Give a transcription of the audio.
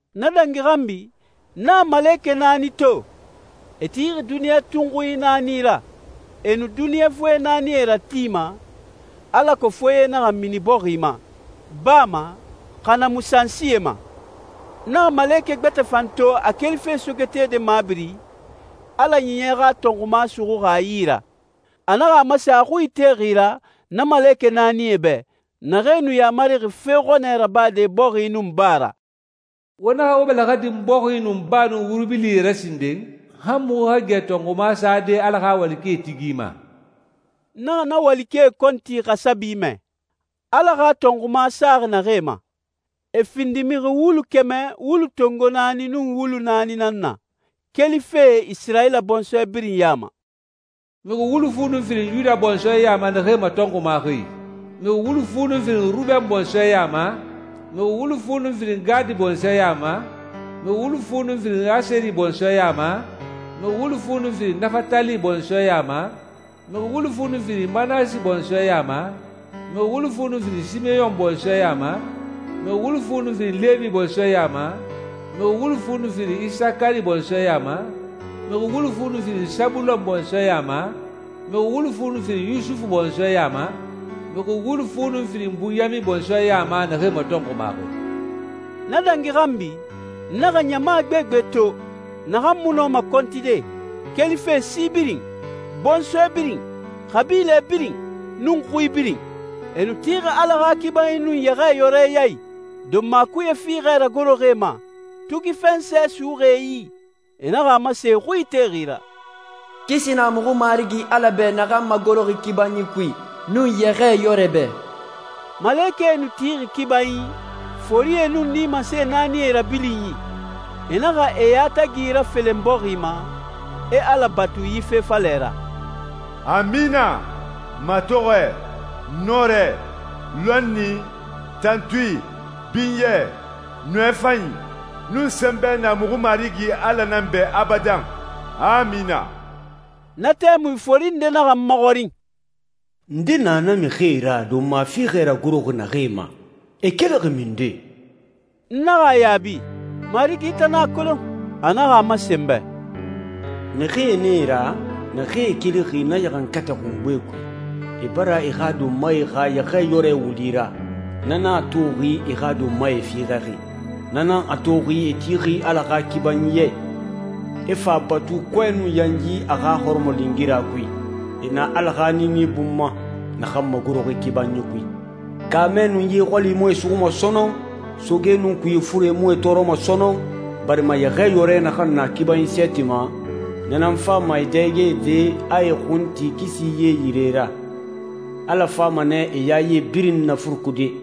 Na dangi xanbi, n naxa malekɛ naani to, e tixi duniɲa tunxui naani ra. E nu duniɲa foye naani ratima, alako foye naxa mini bɔxi ma, baa ma, xa na mu sansie ma. N naxa malekɛ gbɛtɛ fan to a kelife sogetede mabiri, Ala Ɲiɲɛ xa tɔnxuma suxuxi a yi ra. A naxa a masen a xui itexi ra, na malekɛ naanie bɛ, naxee nu yamarixi fe xɔnɛ rabade bɔxi nun baa ra, «Wo naxa wo bɛlɛxɛ din bɔxi nun baa nun wuri bilie ra sinden, han muxu xa gɛ tɔxunma sade Ala xa walikɛe tigi ma. N naxa na walikɛe kɔnti xasabi mɛ, Ala xa tɔnxuma saxi naxee ma. E findi mixi wulu kɛmɛ wulu tongo naani nun wulu naani nan na, kelife Isirayila bɔnsɔɛ birin ya ma. Mixi wulu fu nun firin Yuda bɔnsɔɛ ya ma naxee matɔnxumaxi, mixi wulu fu nun firin Ruben bɔnsɔɛ ya ma, mixi wulu fu nun firin Gadi bɔnsɔɛ ya ma, mixi wulu fu nun firin Aseri bɔnsɔɛ ya ma, mixi wulu fu nun firin Nafatali bɔnsɔɛ ya ma, mixi wulu fu nun firin Manasi bɔnsɔɛ ya ma, mixi wulu fu nun firin Simeyɔn bɔnsɔɛ ya ma, mixi wulu fu nun firin Lewi bɔnsɔɛ ya ma, mixi wulu fu nun firin Isakari bɔnsɔɛ ya ma, mixi wulu fu nun firin Sabulon bɔnsɔɛ ya ma, mixi wulu fu nun firin Yusufu bɔnsɔɛ ya ma, mixi wulu fu nun firin Bunyamin bɔnsɔɛ ya ma naxee matɔnxumaxi.» Na dangi xanbi, n naxa ɲama gbegbe to, naxan mu nu nɔma kɔntide, kelife si birin, bɔnsɔɛ birin, xabilɛ birin, nun xui birin. E nu tixi Ala xa kibanyi nun Yɛxɛɛyɔrɛ ya i, donma kuye fiixɛ ragoroxi e ma, tugi fɛnsɛ suxuxi e yi. E naxa a masen e xui itexi ra, «Kisi na muxu Marigi Ala bɛ naxan magoroxi kibanyi kui, nun Yɛxɛɛyɔrɛ bɛ.» Malekɛe nu tixi kibanyi, forie nun nimase naanie rabilinyi, e naxa e yatagi rafelen bɔxi ma, e Ala batu yi fe falɛ ra, «Amina. Matɔxɔɛ, nɔrɛ, lɔnni, tantui, binyɛ, nɔɛ fanyi, nun sɛnbɛ na muxu Marigi Ala nan bɛ abadan. Amina.» Na tɛmui fori nde naxa n maxɔrin, «Nde na na mixie ra donma fiixɛ ragoroxi naxee ma? E kelixi minden?» N naxa a yaabi, «N Marigi, i tan nan a kolon.» A naxa a masen n bɛ, «Mixie nan e ra, naxee kelixi na ɲaxankatɛ xungbe kui. E bara e xa donmae xa Yɛxɛɛyɔrɛ wuli ra, na nan a toxi e xa donmae fiixɛxi. Na nan a toxi e tixi Ala xa kibanyi ya i, e fa a batu kɔɛ nun yanyi a xa hɔrɔmɔlingira kui. E na Ala xa niini bun ma, naxan magoroxi kibanyi kui. Kaamɛ nun ye xɔli mu e suxuma sɔnɔn, soge nun kuye fure mu e tɔɔrɔma sɔnɔn, barima Yɛxɛɛyɔrɛ naxan na kibanyi sɛɛti ma, na nan fama e dɛgede, a e xun ti kisi ye yire ra. Ala fama nɛ e yaye birin nafurukude.»